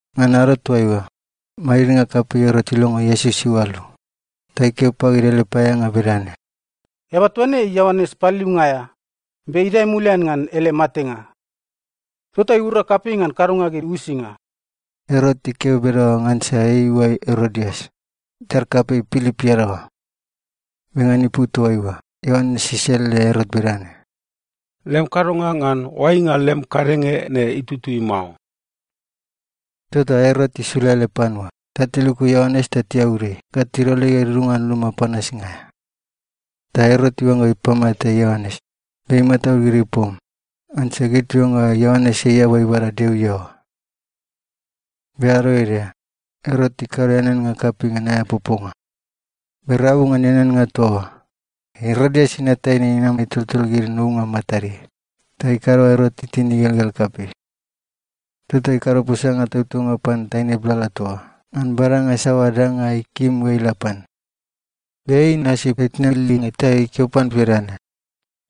Ngan ado toaiua, madidnga kapei Erot ilongo Iesus iualu. Ta ikeo pagid ele paeaeanga bedane, “Eaba toa ne ei Ioanes Paliliunga aea, be idae mulian ngan ele matenga. Tota iura kapei ngan kadonga gid uisinga.” Erot ikeo bedaoa ngansa ei iuai Erodias, itar kapei Pilip iadaoa. Be ngan ipu toaiua Ioanes iselele Erot bedane, “Lem kadonga ngan oainga lem kadenge ne itutui mao.” Tota Erot isula ele panua ta tiluku Ioanes ta tiaud ei ga tidol ei ga idudunga ngan luma panasnga aea. Ta Erot iuangga ipamate Ioanes, be imataud gid ipom, ngansa gid tiuangga Ioanes ei eaba ibada Deo iaoa. Be ado ede, Erot ikado eaneannga kapei ngan aea poponga. Be rabu ngan eaneannga toa oa, Erodias inat taine inam itoltol gid nounga matadeai, ta ikado ga Erot itin igelgel kapei. Tota ikado posanga tautaunga pan taine blala toa oa ngan badanga saoa danga ikim ga ila pan. Be ei inasi itna ilinge ta ikeo pan bedane,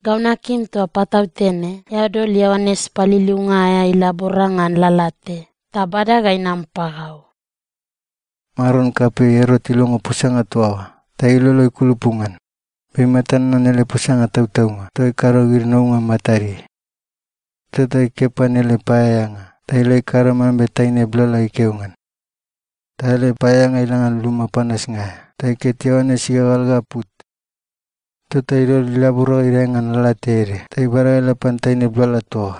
“Gau nakim toa patautene eao dol Ioanes Paliliunga aea ilabora ngan lalate ta bada ga inam pagau.” Maron kapei Erot ilongo posanga toa oa ta ilolo ikulupu ngan, be imata nanan ele posanga tautaunga toa ikado gid nounga matadeai. Tota ikeo pan ele paeaeanga ta ila ikado mambe taine blala ikeo ngan. Ta ele paeaeanga ila ngan luma panasnga aea ta iket Ioanes igagal ga put. Tota idol ilabora ga idae ngan lalate ede ta ibada ga ila pan taine blala toa oa,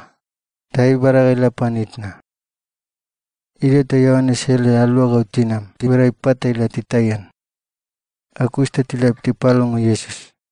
ta ei ibada ga ila pan itna. Idio ta Ioanes ele aluagau tinam tibada ipat ta tila titaian. Ga kus ta tila tipalongo Iesus.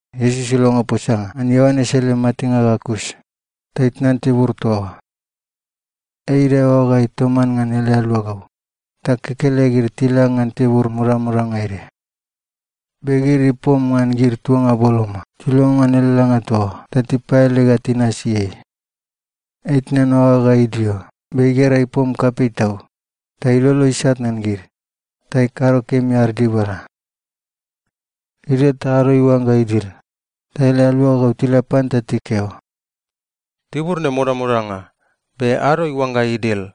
Iesus ilongo posanga ngan Ioanes ele matenga ga kus, ta itnan tibur toa oa. Ei idae oagaeai toman ngan ele aluagau, ta kekelegid tila ngan tibur modamodanga ede. Be gid ipom ngan gid tuanga boloma, tilongo ngan ele langa toa oa ta tipaele ga tinasi ei. Ei itnan oaga ga idio be igera ipom kapei tau, ta ilolo isat ngan gid, ta ikado kemi ad dibala. Idio ta ado iuangga idil, ta ele aluagau tila pan ta tikeo, “Tibur ne modamodanga, be ado iuangga idil.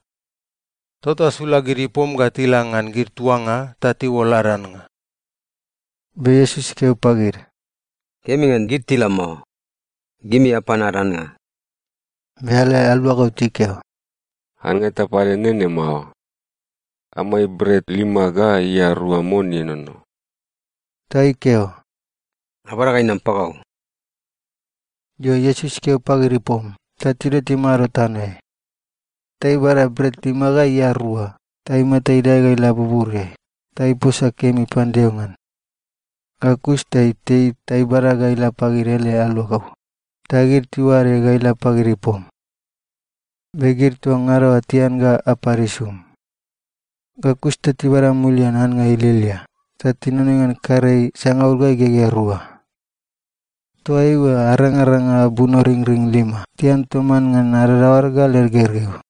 Tota sula gid ipom ga tila ngan gid tuanga ta tiuol ad annga.” Be Iesus ikeo pagid, “Kemi ngan gid tila mao. Gimi apan ad annga.” Be ele aluagau tikeo, “Annga eta pade nene mao. Amai bret lima ga ia rua mon ienono.” Ta ikeo, “Abada ga inam pagau.” Io, Iesus ikeo pagid ipom ta tidio timado tanoeai. Ta ibada bret lima ga ia rua ta imata idae ga ila buburiai ta iposa kemi pan Deo ngan. Ga kus ta itei ta ibada ga ila pagid ele aluagau, ta gid tiuade ga ila pagid ipom. Be gid toa ngada oa tian ga apad isum. Ga kus ta tibada mulian annga ilialia ta tinonoi ngan karei sangaul ga igegea rua. Toa eoa arangaranga bunoringring lima tian toman ngan adadaoad ga led gergeu.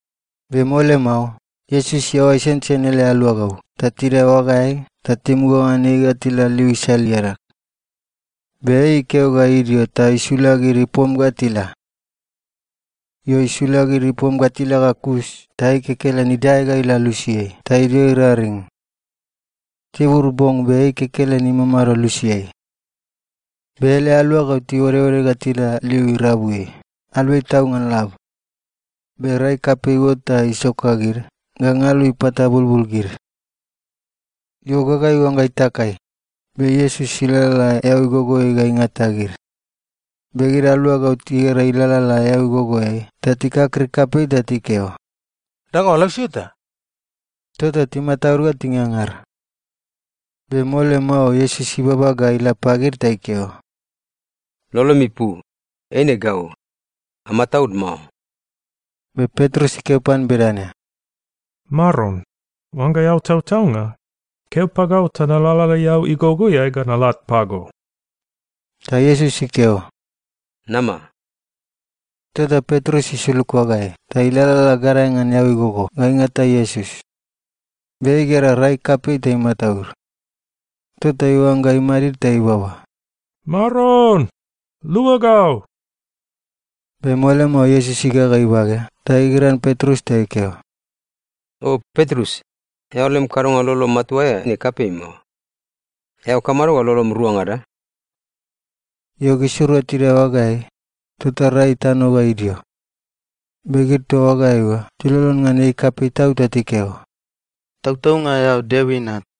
Be mole mao, Iesus iaoa isensen ele aluagau ta tidae oagaeai ta timuga ngan ei ga tila liu isal iadag. Be ei ikeo ga idio ta isula gid ipom ga tila. Io, isula gid ipom ga tila ga kus ta ei kekelen idae ga ila lusiai ta idio iraring. Tibur bong be ei kekelen imamado lusiai. Be ele aluagau tiuodeode ga tila liu irabuiai, aluai tau ngan lab. Be rai kapei iuot ta isoka gid ga ngalu ipatabulbul gid. Io, gaga iuangga itakai, be Iesus ilalala eau igogoeai ga ingata gid. Be gid aluagau tigera ei ilalala eau igogoeai ta tikakrik kapei ta tikeo, “Danga oa lausio eta!” Tota timataud ga tingangar. Be mole mao Iesus ibaba ga ila pagid ta ikeo, “Lolomi pu! Eine gau. Amataud mao.” Be Petrus ikeo pan bedane, “Maron, oangga eao tautaunga, keo pagau ta nalalala eau igogoeai ga nalat pago.” Ta Iesus ikeo, “Nama.” Tota Petrus isulug oagaeai ta ilalala gadae ngan eau igogo ga ingata Iesus. Be ei igera rai kapei ta imataud. Tota iuangga imadi ta ibaba, “Maron, lua gau!” Be mole mao, Iesus igaga ibage ta igigiran Petrus ta ikeo, “O Petrus, eao lem kadonga lolo matua aea ne kapei mao. Eao kamado ga lolom ruangada?” Io, gisirua tidae oagaeai, tota rai itano ga idio. Be gid toa oagaeai oa tilolon ngan ei kapei tau ta tikeo, “Tautaunga, eao Deo Inat.”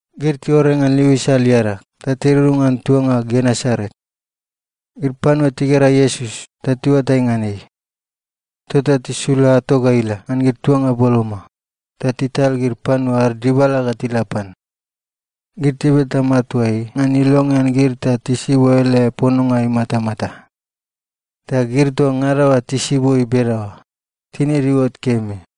Gid tiuore ngan liu isal iadag ta tidudunga ngan tuanga Genesaret. Gid panua tigera Iesus ta tiuatai ngan ei. Tota tisula ato ga ila ngan gid tuanga boloma, ta tital gid panua ad dibala ga tila pan. Gid tibeta matua ei ngan ilongean gid ta tisibo ele pononga imatamata. Ta gid toa ngada oa tisibo ei bedaoa, tinid iuot kemi.